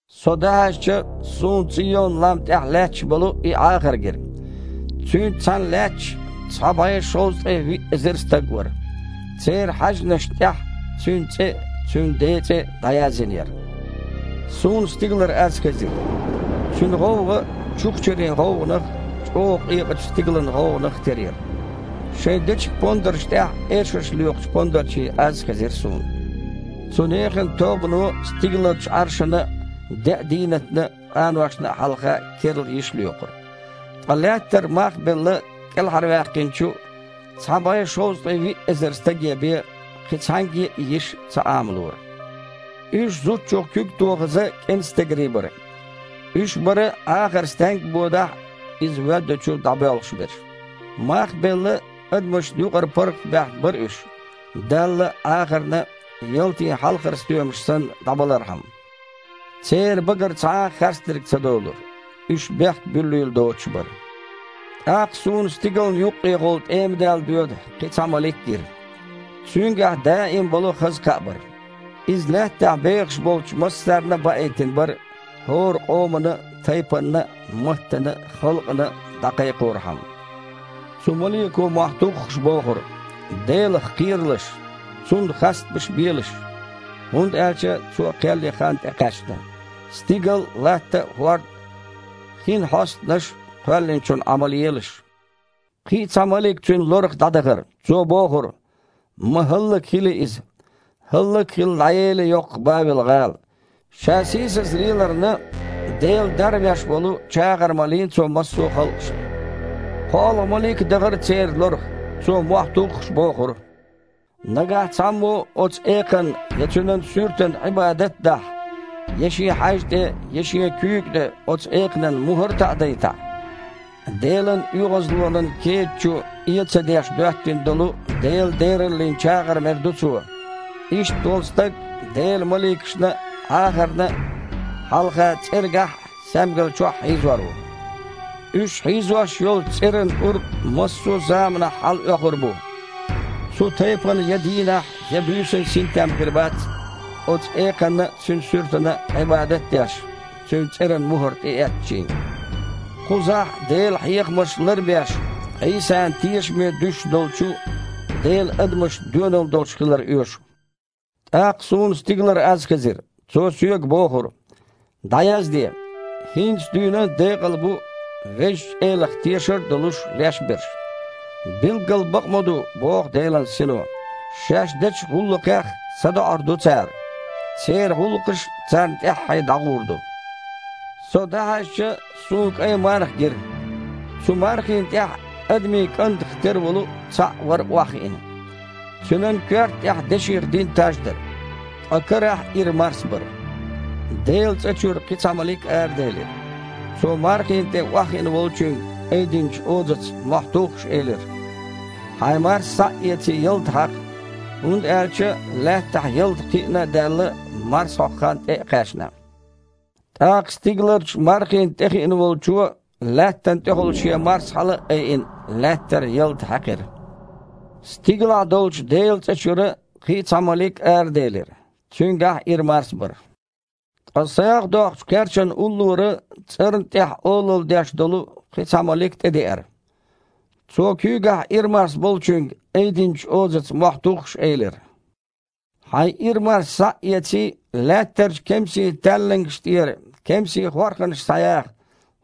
Со дІахьаьжча, суна Цийон-лам тІехь лаьтташ болу и Іахар гира. Цуьнца цхьаьна лаьтташ цхьа бІе шовзткъе виъ эзар стаг вара. Церан хьаьжнашна тІехь Цуьнан цІе а, Цуьнан Ден цІе а дІаязйина яра. Суна стигалара аз хезира. Цуьнан гІовгІа чухчарин гІовгІанах а, чІогІа къекъачу стигалан гІовгІанах а тера яра. Шайн дечиг-пондаршна тІехь эшарш лоькхучу пондарчийн аз а хезира суна. Цу нехан тобано стигаларчу Іаршана а, деа дийнатна а, къаношна а хьалха керла йиш лоькхура. Ткъа лаьттара, мах а белла, кІелхьарваьккхинчу, цхьа бІе шовзткъе виъ эзар стаге бен, кхин цхьаьнгге а и йиш ца Іамалора. Уьш, зудчух куьг тохаза, кІантстегарий бара. Уьш бара, Іахар стенгга бодахь а, Иза воьддучу дІабоьлхуш берш. Мах а белла, адамашна юкъара паргІатбаьхна бара уьш, Далла а, Іахарна а ялтин хьалхара стоьмаш санна дІабалархьама. Церан багара цхьа а харцдерг ца долура, уьш бехк буьллийла доцуш бара. ТІаккха суна стигална юккъехула тІемадаьлла доьду кхин а цхьа малик гира. Цуьнгахь даим болу хаза кхаъ бара, иза Лаьттахь бехаш болчу массарна а баийтина бара, хІора къомана а, тайпанна а, маттана а, халкъана а дІакхайкхорхьама. Цу малико, мохь туххуш, бохура: «Делах кхералаш! Цунна хастамаш белаш! ХІунда аьлча Цо кхел ен хан тІекхаьчна. Стигал а, латта а, хІорд а, хин хьостанаш а Кхоьллинчунна Іамал елаш». Кхин а цхьа малик цуьнан лорах дІадахара. Цо бохура: «Ма хІаллакьхили иза! ХІаллак а хилла, дІаели йоккха Бавел-гІала. Ша сийсаза леларна, Дела дарвеш волу чагІар малийна цо массо а халкъашна». КхоалгІа малик а дахара церан лорах. Цо, мохь туххуш, бохура: «Нагахь цхьаммо оцу экханна я цуьнан суьртана Іибадат а дахь, я шен хьаьжа тІе, я шен куьйга тІе цу экханан мухІар а таІадайтахь, Делан оьгІазлонан кеда чу, э а ца деш, доьттина долу Делан дераллин чагІар мер ду цо. Иштта волу стаг Делан маликашна а, Іахарна а хьалха цІергахь а, саьмгал чохь а хьийзор ву. Уьш хьийзош йолчу цІеран кІур массо а заманахь хьалаоьхур бу. Цу тайпана я дийнахь, я буьйсанна синтем хир бац, оцу экханна а, цуьнан суьртана а Іибадат а деш, цуьнан цІеран мухІар тІеэцначийн». Кхузахь, Делан хьехамаш лар а беш, Іийсана тешаме дуьсуш долчу Делан адамашна доьналла долуш хилар оьшу. ТІаккха суна стигалара аз хезира. Цо соьга бохура: «ДІаязде: „ХІинца дуьйна декъал бу, Везачу Элах тешар а долуш, леш берш“». «Билггал бакъ ма ду, – боху Делан Сино, – Шаьш дечу гІуллакхех садоІур ду цара. Церан гІуллакхаш а царна тІаьххье дІагІур ду». Со дІахьаьжча, суна кІайн марха гира. Цу мархина тІехь «адамийн кІантах тера волу цхьаъ» вара охьахиъна. Цуьнан коьрта тІехь деших дина таж дара. Ткъа карахь ира марс бара. Делан цІа чуьра кхин а цхьа малик араделира. Цо мархина тІе охьахиъна волчуьнга айдинчу озаца, мохь туххуш, элира: «Хьайн марс схьа а эций, ялта хьакха! ХІунда аьлча лаьттахь ялта кхиъна а даьлла, марс хьокху хан тІе а кхаьчна». ТІаккха стигаларчу мархина тІехиъна волчо, лаьттана тІехула шен марс хьала а айина, лаьттара ялта хьаькхира. Стигалахь долчу Делан цІа чуьра кхин а цхьа малик араделира. Цуьнгахь а ира марс бара. Ткъа сагІа доккхучу кхерчана уллора цІарна тІехь олалла деш долу кхин а цхьа малик тІедеара. Цо куьйгахь ира марс болчуьнга айдинчу озаца, мохь туххуш, элира: «Хьайн ира марс схьа а эций, лаьттарчу кемсийн таьллангашна тІера кемсийн хорханаш схьаяха,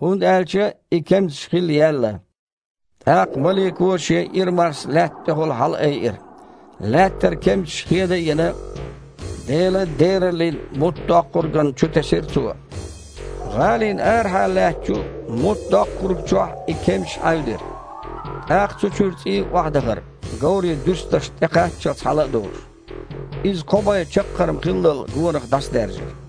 хІунда аьлча и кемсаш хилла яьлла». ТІаккха малико шен ира марс лаьтта тІехула хьалаайира. Лаьттара кемсаш, хеда а йина, Делан дераллин муттдоккхургана чу тесира цо. ГІалина арахьа лаьттачу муттдоккхурга чохь и кемсаш Іаьвдира. ТІаккха цу чуьра цІий охьадахара, говрийн дуьрстанашна тІе кхаччалц хьала а долуш. Иза кхо бІе чаккхарма хиллал гонах дІасадаьржира.